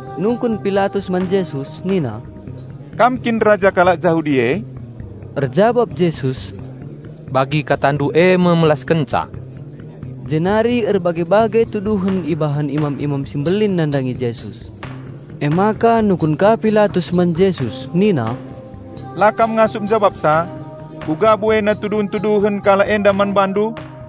Nungkun Pilatus man Jesus nina, "Kam kin raja kalak Jahudi?" Erjabap Jesus, "Bage me nindu!" Jenari erbage-bage tuduhen ibahan imam-imam si mbelin nandangi Jesus. Emaka nungkun ka Pilatus man Jesus nina, "La kam ngasup njabapsa? Kuga buena tuduhen-tuduhen kalak enda man BaNdu!"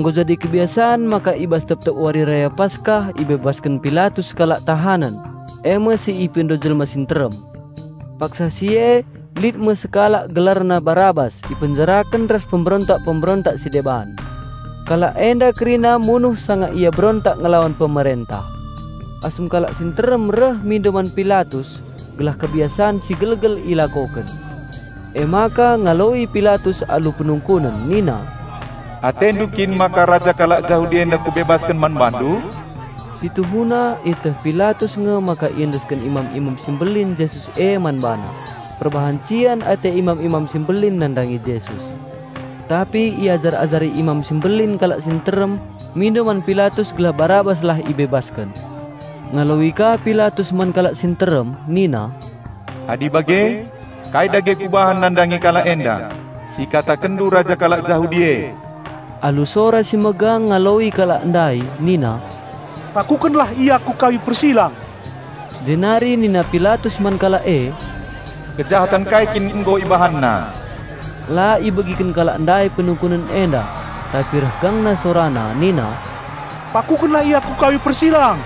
Nggo jadi kebiasan maka i bas tep-tep Wari Raya Paskah ibebasken Pilatus sekalak tahanen, e me si ipindo jelma si nterem. Paksa si e lit me sekalak gelarna Barabas ipenjaraken ras pemberontak-pemberontak si deban. Kalak enda kerina munuh sanga ia berontak ngelawan pemerentah. Asum kalak si nterem reh mindo man Pilatus gelah kebiasan si gelgel ilakoken. Emaka ngaloi Pilatus alu penungkunen nina, "Atendu kin maka raja kalak Jahudi enda kubebasken man bandu?" Si tuhuna ieteh Pilatus nge maka iendesken imam-imam si mbelin Jesus e man bana perbahan cian ate imam-imam si mbelin nandangi Jesus. Tapi iajar-ajari imam si mbelin kalak si nterem mindo man Pilatus gelah Barabaslah ibebasken. Ngaloi ka Pilatus man kalak si nterem nina, "Adi bage, kai dage kubahan nandangi kalak enda, si ikatakenndu raja kalak Jahudi e?" Alu sora si megang ngaloi kalak ndai nina, "Pakukenlah Ia ku kayu persilang!" Jenari nina Pilatus man kalak e, "Kejahaten kai kin nggo IbahanNa?" La ibegiken kalak ndai penungkunen enda, tapi reh gangna sorana nina, "Pakukenlah Ia ku kayu persilang!"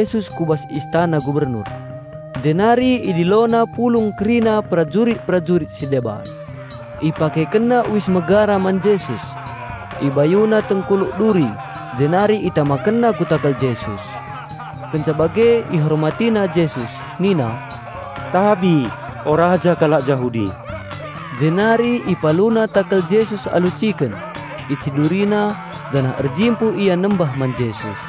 Emaka ibaba perajurit-perajurit me Jesus ku bas istana gubernur, jenari idilona pulung kerina perajurit-perajurit si deban. Ipakekenna uis megara man Jesus. Ibayuna tengkuluk duri, jenari itamakenna ku takal Jesus. Kenca bage "ihormati" na Jesus nina, "Tabi, o raja kalak Jahudi!" Jenari ipaluna takal Jesus alu ciken, icidurina, janah erjimpuh ia nembah man Jesus.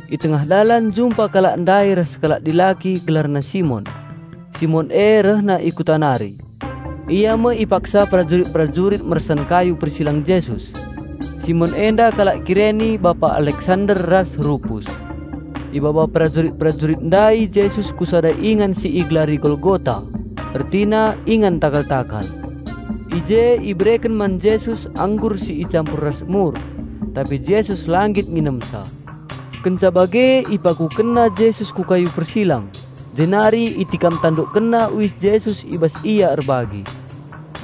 I tengah dalan jumpa kalak ndai ras sekalak dilaki gelarna Simon. Simon e rehna i kuta nari. Ia me ipaksa perajurit-perajurit mersan kayu persilang Jesus. (Simon enda kalak Kireni bapa Alexander ras Rupus.) Ibaba perajurit-perajurit ndai Jesus ku sada ingan si igelari Golgota, ertina, "Ingan takal-takal". I je ibereken man Jesus anggur si icampur ras mur. Tapi Jesus la nggit nginemsa. Kenca bage ipakukenna Jesus ku kayu persilang jenari itikam tandukkenna uis Jesus i bas ia erbagi.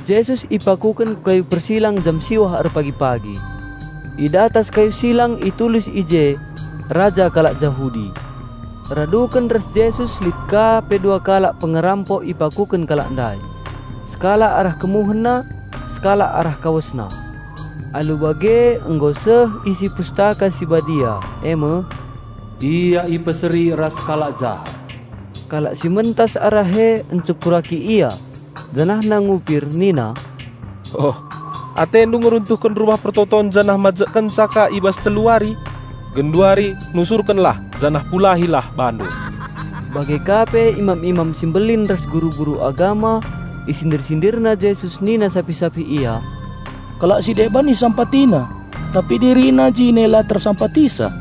Jesus ipakuken ku kayu persilang jam siwah erpagi-pagi. I datas kayu silang itulis i je, "Raja Kalak Jahudi". Raduken ras Jesus lit ka pe dua kalak pengerampok ipakuken kalak ndai. Sekalak arah KemuhenNa, sekalak arah KawesNa. (Alu bage nggo seh isi Pustaka Si Badia e me, "Ia ipeseri ras kalak jahat".) Kalak si mentas arah e ncekuraki Ia janahna ngupir nina, "Oh! AteNdu ngeruntuhken Rumah Pertoton janah majekkenca ka i bas telu wari. Genduari nusurkenlah janah pulahilah BaNdu!" Bage ka pe imam-imam si mbelin ras guru-guru agama isindir-sindirna Jesus nina sapih-sapih ia, "Kalak si deban IsampatiNa, tapi DiriNa jine la TersampatiNa.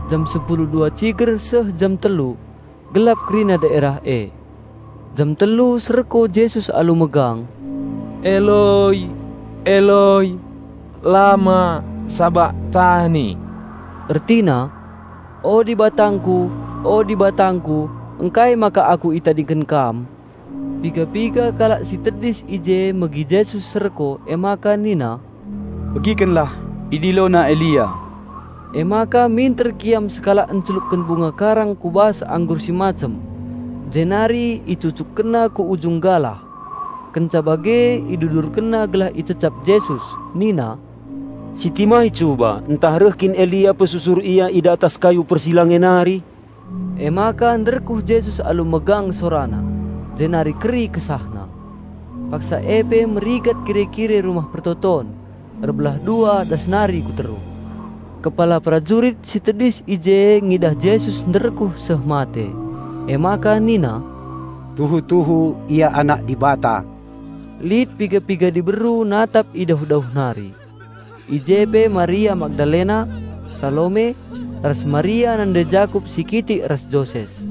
Jam sepulu dua ciger seh jam telu, gelap kerina daerah e. Jam telu serko Jesus alu megang, "Eloi, Eloi, lama sabakhtani!" Ertina, "O DibatangKu, o DibatangKu, ngkai maka Aku itadingken Kam?" Piga-piga kalak si tedis i je megi Jesus serko emaka nina, "Begikenlah, idilona Elia." Emaka minter kiam sekalak encelupken bunga karang ku bas anggur si macem, jenari icucukkenna ku ujung galah. Kenca bage idudurkenna gelah icecap Jesus. Nina, "Sitimai cuba, ntah reh kin Elia pesusur Ia i datas kayu persilang e nari!" Emaka nderkuh Jesus alu megang SoraNa jenari keri KesahNa. Paksa e pe merigat kire-kire Rumah Pertoton; erbelah dua das nari ku teruh. Kepala perajurit si tedis i je ngidah Jesus nderkuh seh mate, emaka nina, "Tuhu-tuhu Ia Anak Dibata." Lit piga-piga diberu natap i dauh-dauh nari. I je pe Maria Magdalena, Salome, ras Maria nande Jakup si kitik ras Joses.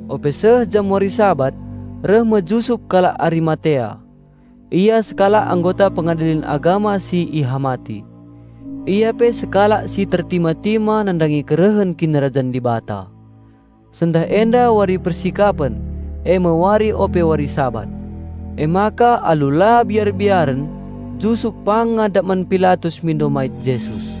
Ope seh jam wari Sabat, reh me Jusup kalak Arimatea. Ia sekalak anggota Pengadilen Agama si ihamati. Ia pe sekalak si tertima-tima nandangi kerehen Kinirajan Dibata. Sendah enda wari Persikapen (eme wari ope wari Sabat). Emaka alu la biar-biaren Jusup pang ngadap man Pilatus mindo mait Jesus.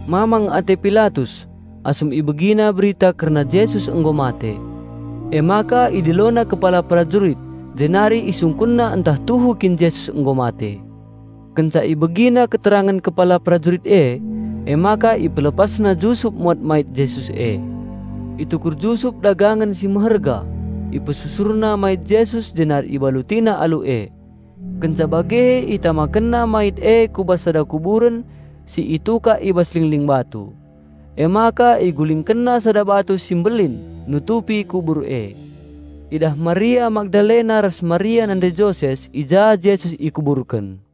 Mamang ate Pilatus, asum ibegina berita kerna Jesus nggo mate. Emaka idilona kepala perajurit jenari isungkunna ntah tuhu kin Jesus nggo mate. Kenca ibegina keterangen kepala perajurit e, emaka ipelepasna Jusup muat mait Jesus e. Itukur Jusup dagangen si meherga, ipesusurna mait Jesus jenari ibalutina alu e. Kenca bage itamakenna mait e ku bas sada kuburen si itukak i bas lingling batu. Emaka igulingkenna sada batu si mbelin nutupi kubur e. Idah Maria Magdalena ras Maria nande Joses i ja Jesus ikuburken.